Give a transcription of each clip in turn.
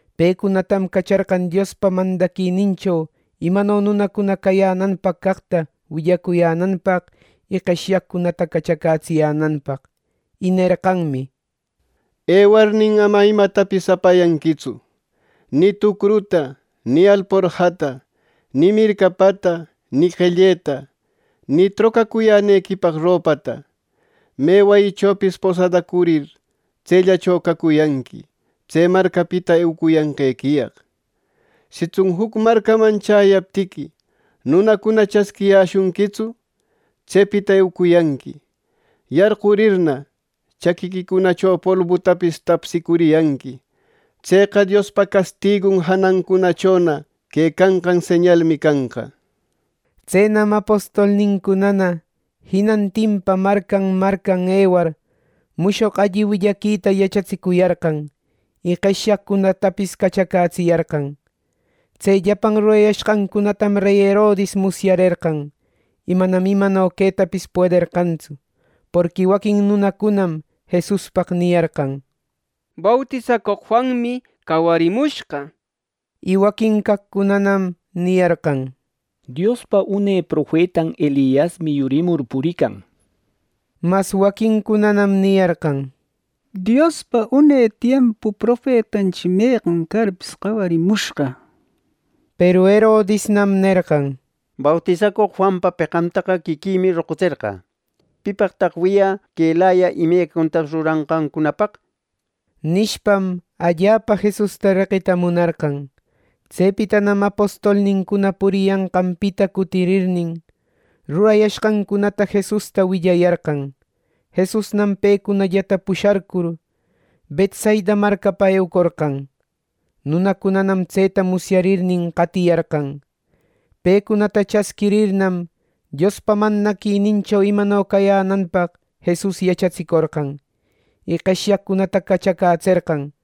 Pecunatam cacharqan Diospa mandaquinincho imano nunacuna cayänanpaq caqta willacuyänanpaq y qeshyaqcunata cachacätsiyänanpaq. Y nerqanmi: —Ewarnin, ama imatapis apayanquitsu: ni tucruta, ni alporjata, ni mircapata, ni qelleta, ni trocacuyänequipaq ropata. Me wayichopis posadacurir, tsellacho cacuyanqui tse marcapita eucuyanqequiyaq. Sitsun juc marcaman chäyaptiqui nunacuna chasquiyäshunquitsu, tsepita eucuyanqui. Yarqurirna, chaquiquicunacho polbutapis tapsicuriyanqui. Tseqa Diospa castigun janancunachona quecanqan señalmi canqa. Tsenam apostolnincunana jinantinpa marcan marcan ewar, mushoq alli willaquita yachatsicuyarqan, y qeshyaqcunatapis cachacätsiyarqan. Tse llapan rurayashqancunatam rey Herodis musyarerqan. Y manam imano quetapis puederqantsu, porqui waquin nunacunam Jesuspaq niyarqan “Bautisacoq Juanmi cawarimushqa” nir. Y waquin caqcunanam niyarqan: —Diospa une profetan Eliasmi yurimur purican —nir. Mas waquincunanam niyarqan: —Diospa une tiempu profetanchi meqan carpis cawarimushqa —nir. Peru Herodisnam nerqan: —Bautisacoq Juanpa peqantaqa quiquïmi roqutserqä. ¿Pipaqtaq wiyä quelaya imecacunatapis ruranqancunapaq? —nishpam, allapa Jesusta reqita munarqan. Tsepitanam apostolnincuna puriyanqanpita cutirirnin, rurayashqancunata Jesusta willayarqan. Jesusnam pecunallata pusharcur, Betsaida marcapa eucorqan. Nunacunanam tseta musyarirnin, qatiyarqan. Pecunata chasquirirnam, Diospa mandaquinincho imano cayänanpaq Jesus yachatsicorqan, y qeshyaqcunata cachacätserqan.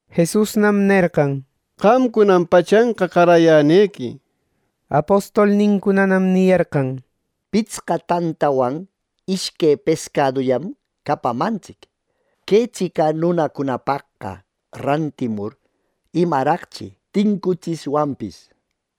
Jesusnam nerqan: —Qamcunam pachanqa qarayänequi. Apostolnincunanam niyarqan: —¡Pitsqa tantawan ishque pescadullam capamantsic! Que tsica nunacunapaqqa rantimur, ¿imaraqchi tincutsishwanpis!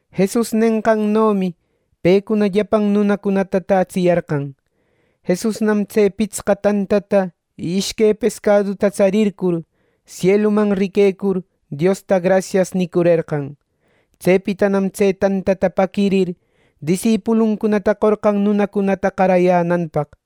Jesus nenqannomi pecuna llapan nunacunata tätsiyarqan. Jesusnam tse pitsqa tantata y ishque pescaduta tsarircur sieluman riquecur, Diosta “Grasias” nicurerqan. Tsepitanam tse tantata paquirir disipuluncunata qorqan nunacunata qarayänanpaq.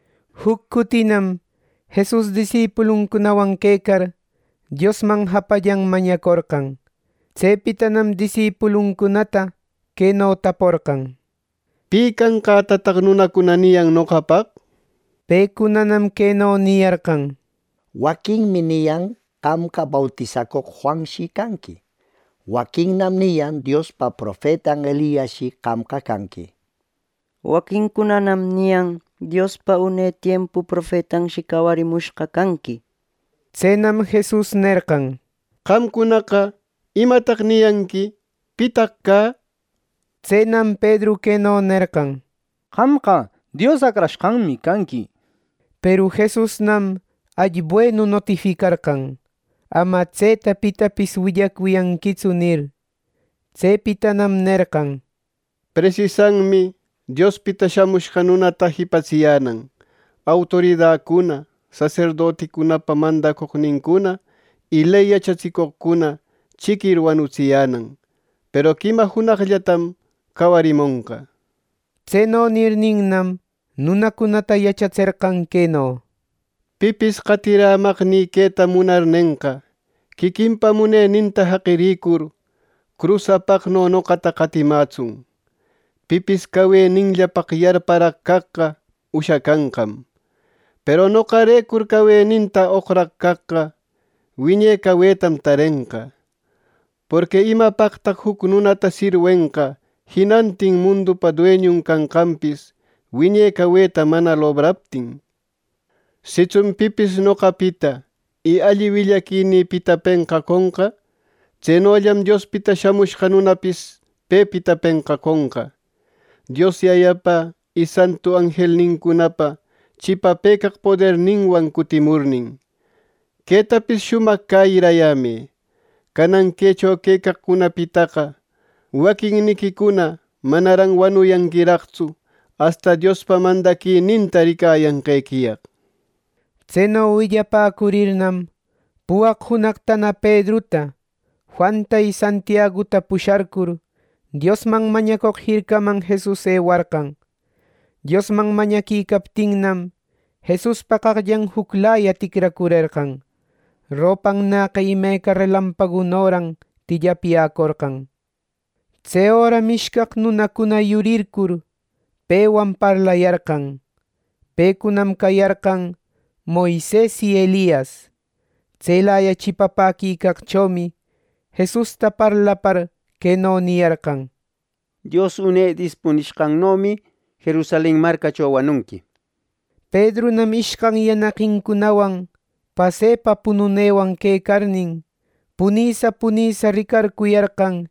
Juc cutinam Jesus disipuluncunawan quecar, Diosman japallan mañacorqan. Tsepitanam disipuluncunata queno taporqan: —¿Pi canqätataq nunacuna niyan noqapaq? Pecunanam queno niyarqan: —Waquinmi niyan qamqa bautisacoq Juanshi canqui. Waquinnam niyan Diospa profetan Eliasshi qamqa canqui. Waquincunanam niyan Diospa une tiempu profetanshi cawarimushqa canqui. Tsenam Jesus nerqan: —Qamcunaqa, ¿imataq niyanqui? ¿Pitaq cä? Tsenam Pedru queno nerqan: —¡Qamqa Dios Acrashqanmi canqui! —nishpa. Peru Jesusnam alli buenu notificarqan: —Ama tseta pitapis willacuyanquitsu —nir. Tsepitanam nerqan: —Presisanmi Diospita Shamushqa Nunata jipatsiyänan, autoridacuna, saserdoticunapa mandacoqnincuna y ley yachatsicoqcuna chiquir wanutsiyänan. Peru quima junaqllatam cawarimonqa. Tseno nirninnam, nunacunata yachatserqan queno: —Pipis qatirämaqnï queta munarnenqa, quiquinpa muneninta jaqiricur, crus apaqno noqata qatimätsun. Pipis caweninllapaq yarparaq caqqa ushacanqam; peru noqarecur caweninta oqraq caqqa wiñe cawetam tarenqa. Porqui ¿imapaqraq juc nunata sirwenqa jinantin mundupa dueñun canqanpis, wiñe caweta mana lobraptin! Sitsun pipis noqapita y alli willaquinïpita penqaconqa, tsenollam Diospita Shamushqa Nunapis pepita penqaconqa, Dios Yayapa, y santu anjelnincunapa chipapëcaq poderninwan cutimurnin. Quetapis shumaq cäyirayämë: Canan quecho quecaqcunapitaqa waquinniquicuna manaran wanuyanquiraqtsu, asta Diospa mandaquininta ricayanqequiyaq. Tseno willapäcurirnam, puwaq junaqtana Pedruta, Juanta y Santiaguta pusharcur, Diosman mañacoq jircaman Jesus ewarqan. Diosman mañaquicaptinnam, Jesuspa qaqllan juclaya ticracurerqan, ropannäqa imeca relampagunoran tillapyäcorqan. Tse öram ishcaq nunacuna yurircur, pewan parlayarqan. Pecunam cayarqan Moises y Elias. Tselaya chipapäquicaqchomi Jesusta parlapar, queno niyarqan: —Dios une dispunishqannomi Jerusalen marcacho wanunqui —nir. Pedrunam ishcan yanaqincunawan pasepa pununewan quecarnin, punïsa punïsa ricarcuyarqan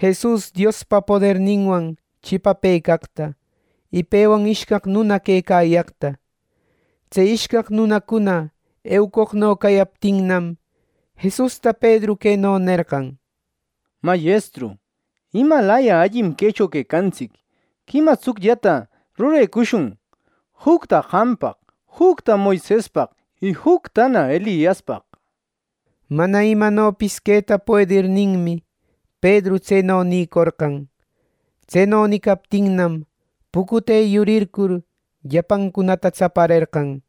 Jesus Diospa poderninwan chipapëcaqta y pewan ishcaq nuna quecayaqta. Tse ishcaq nunacuna eucoqno cayaptinnam, Jesusta Pedru queno nerqan: —Mayestru, ¡imalaya allim quecho quecantsic! ¡Quima tsucllata rurecushun: jucta qampaq, jucta Moisespaq y juctana Eliaspaq! Mana imanopis queta puedirninmi, Pedru tseno nïcorqan. Tseno nicaptinnam, pucute yurircur, llapancunata tsaparerqan.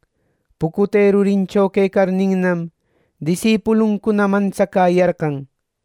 Pucute rurincho quecarninnam, disipuluncuna mantsacäyarqan.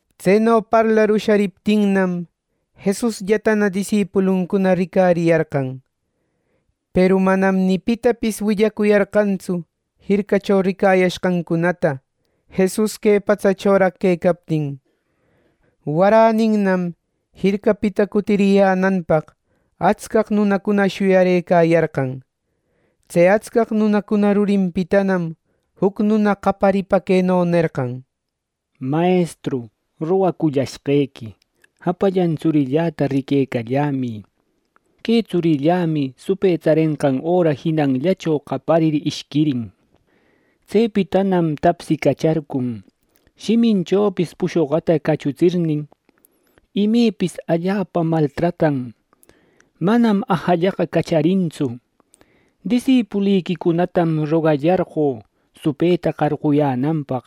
Tseno parlar ushariptinnam, Jesusllatana disipuluncuna ricariyarqan. Peru manam ni pitapis willacuyarqantsu jircacho ricayashqancunata Jesus que patsachoraq quecaptin. Waräninnam jircapita cutiriyänanpaq, atscaq nunacuna shuyarëcayarqan. Tse atscaq nuna rurinpitanam juc nuna qayaripa queno nerqan: —Mayestru, rogacullashqequi. Japallan tsurilläta riquecallämï. Que tsurillämi supë tsarenqan öra jinanllacho qaparir ishquirin. Tsepitanam tapsicacharcun, shiminchopis pushoqata cachutsirnin. Imepis allapam maltratan, manam ajallaqa cacharintsu. Disipuliquicunatam rogacullarqö supëta qarquyänanpaq,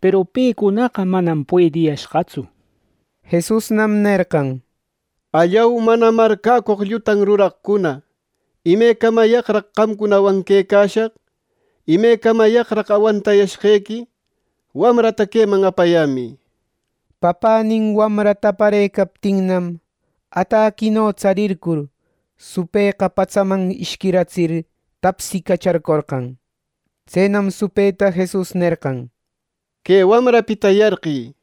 peru pecunaqa manam puediyashqatsu. Jesusnam nerqan: —¡Allau, mana marcäcoq llutan ruraqcuna! ¡Imecamayaqraq qamcunawan quecashaq! ¡Imecamayaqraq awantayashqequi! ¡Wamrata queman apayämï! —nir. Papänin wamranta aparëcaptinnam, ataquino tsarircur, supëqa patsaman ishquiratsir, tapsicacharcorqan. Tsenam supëta Jesus nerqan: —Que wamrapita yarqï —nirnin.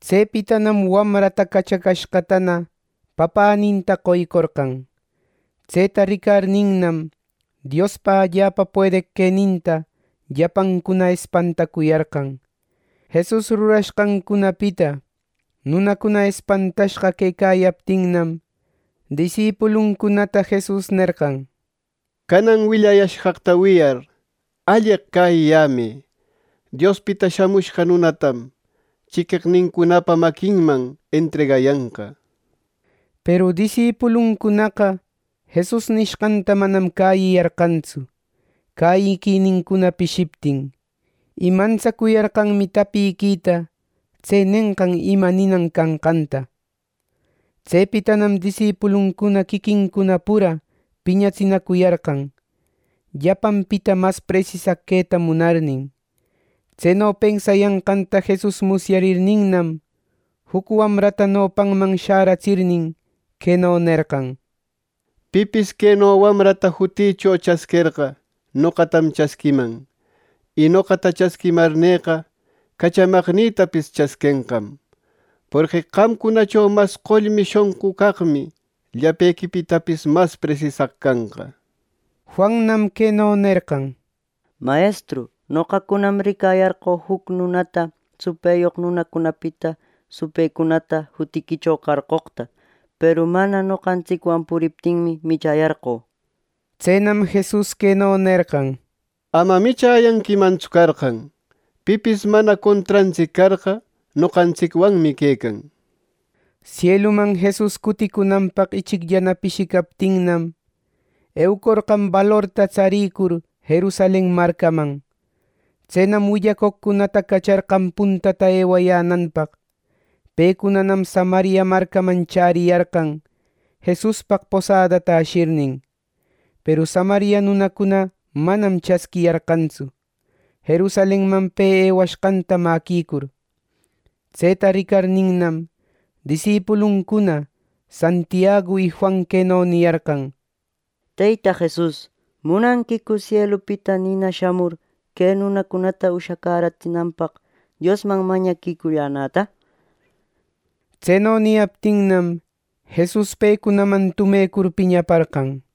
Tsepitanam wamrata cachacashqatana, papäninta qoycorqan. Tseta ricarninnam, Diospa allapa puedeq queninta llapancuna espantacuyarqan. Jesus rurashqancunapita nunacuna espantashqa quecayaptinnam, disipuluncunata Jesus nerqan: —Canan willayashqaqta wiyar, alleq cäyiyämë. Diospita Shamushqa Nunatam chiqueqnincunapa maquinman entregayanqa. Peru disipuluncunaqa Jesus nishqanta manam cäyiyarqantsu, cäyiquinincuna pishiptin. Y mantsacuyarqanmi tapiquita tse nenqam ima ninan canqanta. Tsepitanam disipuluncuna quiquincuna pura piñatsinacuyarqan, llapanpita mas presisaq queta munarnin. Tseno pensayanqanta Jesus musyarirninnam, juc wamrata nopanman shäratsirnin, queno nerqan: —Pipis queno wamrata jutïcho chasquerqa, noqatam chasquiman. Y noqata chasquimarneqa, cachamaqnïtapis chasquenqam. Porqui qamcunacho mas qollmi shonqu caqmi, llapequipitapis mas presisaq canqa. Juannam queno nerqan: —Mayestru, noqacunam ricayarqö juc nunata supëyoq nunacunapita supëcunata jutiquicho qarqoqta. Peru mana noqantsicwan puriptinmi, michäyarqö. Tsenam Jesus queno nerqan: —Ama michäyanquimantsu carqan. Pipis mana contrantsic carqa, noqantsicwanmi quecan. Sieluman Jesus cuticunanpaq ichicllana pishicaptinnam, eucorqan balorta tsarïcur Jerusalen marcaman. Tsenam willacoqcunata cacharqan puntata ewayänanpaq. Pecunanam Samaria marcaman chäriyarqan, Jesuspaq posadata ashirnin. Peru Samaria nunacuna manam chasquiyarqantsu, Jerusalenman pe ewashqanta mäquicur. Tseta ricarninnam, disipuluncuna Santiagu y Juan queno niyarqan: —Teyta Jesus, ¿munanquicu sielupita nina shamur, que nunacunata ushacäratsinanpaq, Diosman mañaquicuyänäta? Tseno niyaptinnam, Jesus pecunaman tumecur piñaparqan.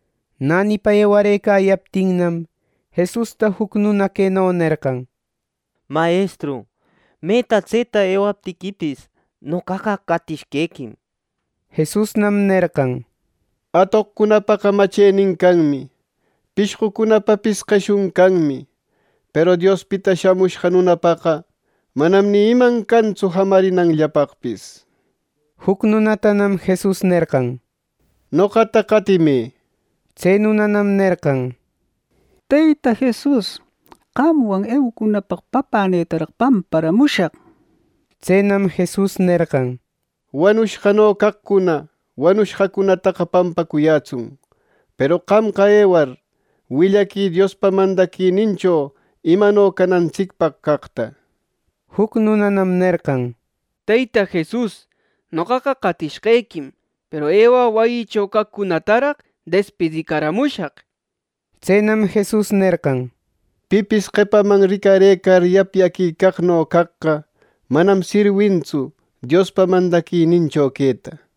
Nänipa ewarëcayaptinnam, Jesusta juc nuna queno nerqan: —Mayestru, meta tseta ewaptiquipis, noqaqa qatishqequim. Jesusnam nerqan: —Atoqcunapa machenin canmi. Pishqucunapapis qeshun canmi. Peru Diospita Shamushqa Nunapaqa manam ni iman cantsu jamarinanllapaqpis. Juc nunatanam Jesus nerqan: —Noqata qatimë. Tse nunanam nerqan: —Teyta Jesus, qamwan eucunapaq papänïtaraq pampamushaq. Tsenam Jesus nerqan: —Wanushqano caqcuna wanushqacunataqa pampacuyätsun. Peru qamqa ewar, willaquï Diospa mandaquinincho imano canantsicpaq caqta. Juc nunanam nerqan: —Teyta Jesus, noqaqa qatishqequim, peru ewä wayïcho caqcunataraq despidicaramushaq. Tsenam Jesus nerqan: —Pipis qepaman ricarëcar yapyaquicaqno caqqa manam sirwintsu Diospa mandaquinincho queta.